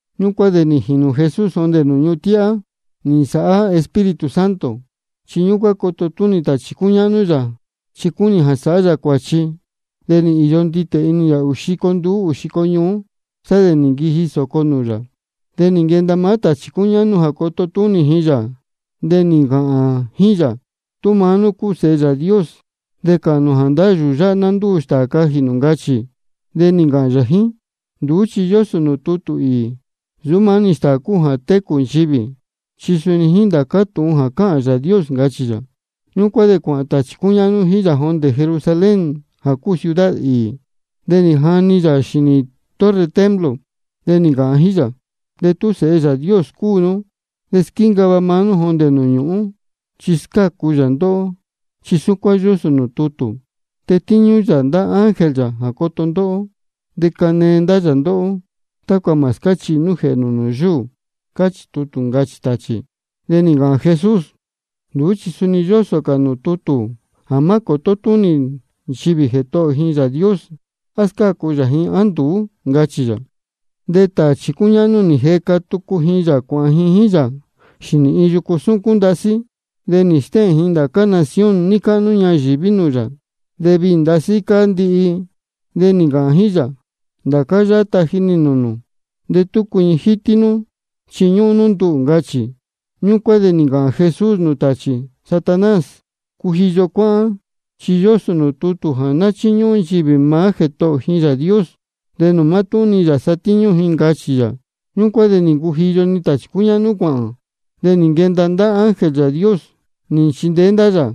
Ñúcuán de nī jīnū Jesús jondē nūū ñuhun tíhá nī nsāhá Espíritu Santo. Chi ñúcuán coto túnī tāchī cúñáhnú yā, chi cúnī jā sāhá yā cuāchi. De nī īyo nditē inī yā ūū xico nduú ūū xico ñuú, sá de nī nquiji sōco nūū yā. De nī nquenda maá tāchī cúñáhnú jā coto túnī ji yā, de nī ncāhān jíín yā: Tú maá nú cúu Sehe Yāā Dios de cāhān nū jā ndá yūū yáhá ná ndúu stāā cajī nū, ncachī. De nī ncāhān yā jíín: Nduú chi yósō nūū tutū īī: Nsūú mátúhún-ni stāā cúu jā técū nchivī, chi suni jíín ndācá tūhun jā cáhān Yāā Dios, ncachī yā. Ñúcuán de cuāhān tāchī cúñáhnú jíín yā jondē Jerusalén jā cúu ciudad īī. De nī jani ji yā xīnī torre templo. De nī ncāhān ji jíín yā: De tú Sēhe Yāā Dios cúu nú, de squíncava nú maá nú jondē nūū ñūhún, chi scácu yā ndóhó. Chi súcuán yósō nūū tutū: Tetíñú yā ndá ángel yā jā coto ndóhó. De canee ndá yā ndóhó, tácua mā scáchihi nú jēhē nū nūū yúū. Cáchī tutū, ncachī tāchī. De nī ncāhān Jesús: Nduú chi suni yósō cā nūū tutū jā má cōtó túnī nchivī Jētohō ji Yāā Dios, á scácu yā ji á nduú, ncachī yā. De tāchī cúñáhnú nī jeca tucu ji yā cuāhān ji jíín yā xīnī iin yucu súcún ndasí. De nī stéhēn ji ndācá nación níí cáhnú ñayīví nūū yā, de viī ndasí cáá ndihi. De nī ncāhān jíín yā: Ndācá yáhá taji nī nūū nū, de tú cuiñi jítí nú chiñúhún nú nduhū, ncachī. Ñúcuán de nī ncāhān Jesús nūū tāchī: Satanás, cujiyo cuáhán, chi yósō nūū tutū jā ná chíñúhún nchivī maá Jētohō ji Yāā Dios, de nūū mátúhún-ni yā satíñú ji, ncachī yā. Ñúcuán de nī ncujiyo-ni tāchī cúñáhnú cuāhān. De nī nquenda ndá ángel Yāā Dios nī nchindeé ndá yā.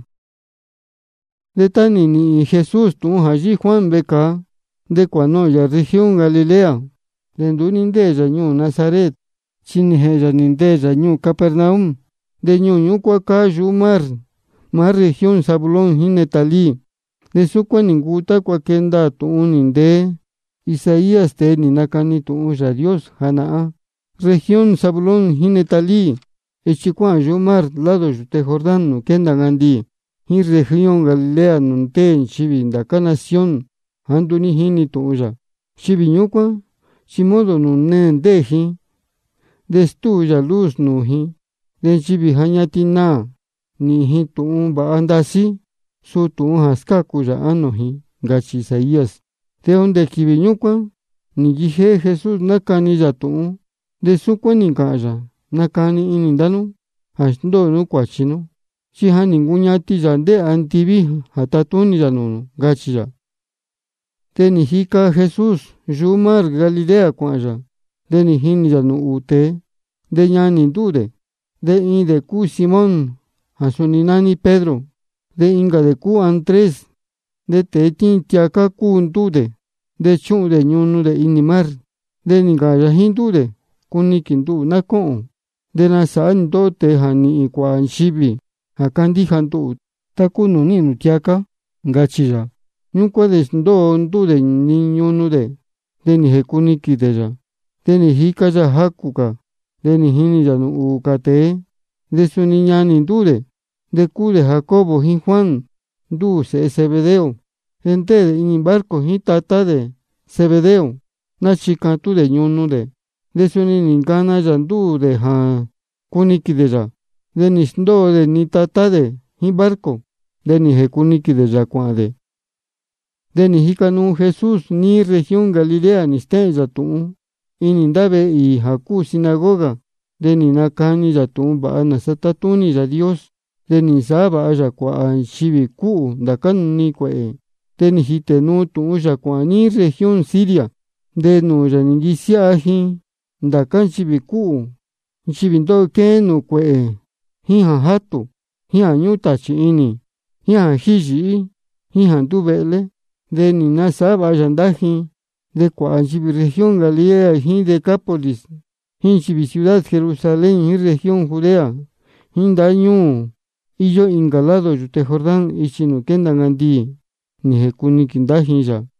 De tá nī nīhīn Jesús tūhun jā yíhí Juan vecāa, de cuānohōn yā región Galilea. De nduú ní ndéē yā ñuū Nazaret, chi nī jēhēn yā nī ndeē yā ñuū Capernaum. De ñuū ñúcuán cáá yuhú mar, maá región Zabulón jíín Neftalí. De súcuán nī ncuu tácua quee ndaā tūhun nī ntee Isaías, tēe nī nacani tūhun Yāā Dios janahán: Región Zabulón jíín Neftalí, ichi jā cuáhān yuhú mar, lado yūte Jordán nūū quénda ncandiī, jíín región Galilea nūū ndéē nchivī ndá cā nación jāá nduú jínī tūhun yā. Nchivī ñúcuán chi modo nūū neē ndéē ji, de stúu yā luz yā nūū ji. De nchivī ja ñatin naā, nīhīn ji tūhun vāha ndasí, suu tūhun jā scácu yā ánō ji. Ncachī Isaías. De jondē quīvī ñúcuán nī nquijéhé Jesús nácani yā tūhun, de súcuán nī ncāhān yā: Nacani inī ndá nú jā sndóo nú cuāchi nú, chi ja nī ncuñatin Yāā ndéē andiví jā tatúnī yā nūū nū, ncachī yā. De jíca Jesús yuhú mar Galilea cuāhān yā. De nī jinī yā nūū ūū tēe, de ñanī ndúū dē. De iin dē cúu Simón jā suni nání Pedro, de incā dē cúu Andrés. De tēe tíin tiacá cúu ndúū dē, de chúhun dē ñunu dē inī mar. De nī ncāhān yā jíín ndúū dē: Cuniquīn nduhū ná cóhōn, de nasāhá nī ndóhó tēe jā nīhīn cuāhā nchivī jā candíja nduhū, tá cúu nūū níhīn nū tiacá, ncachī yā. Ñúcuán de nī sndóo ndúū dē-ni ñunu dē, de nī jēcuniquīn dē yā. De nī jica yā jacū cā, de nī jinī yā nūū ūū cā tēe, de suni ñanī ndúū dē. De cúu dē Jacobo jíín Juan, ndúū sēhe Zebedeo. De ndéē dē inī barco jíín tatá dē Zebedeo, náchicatún dē ñunu dē. De suni nī ncana yā ndúū dē jā cuniquīn dē yā. De nī sndóo dē-ni tatá dē jíín barco, de nī jēcuniquīn dē yā cuāhān dē. De nī jica nuu Jesús níí región Galilea, nī stéhēn yā tūhun inī ndá vehe īī jā cúu sinagoga. De nī nacani yā tūhun vāha nāsa tátúnī Yāā Dios. De nī nasāhá vāha yā nchivī cúhū ndācá-ni cuēhē. De nī jītē nuu tūhun yā cuāhān níí región Siria. De nūū yā nī nquisiáha ji ndācá nchivī cúhū, nchivī jā ndóho quéhén nūū cuēhē, jíín jā játū, jíín jā ñúhún tāchī inī, jíín jā jíhī yīhí, jíín jā ní nduvehlé. De nī nasāhá vāha yā ndá ji. De cuāhā nchivī región Galilea jíín Decápolis, jíín nchivī ciudad Jerusalén jíín región Judea, jíín ndá ñuū jā íyó incā lado yūte Jordán ichi nūū quénda ncandiī, nī jēcuniquīn ndá ji yā.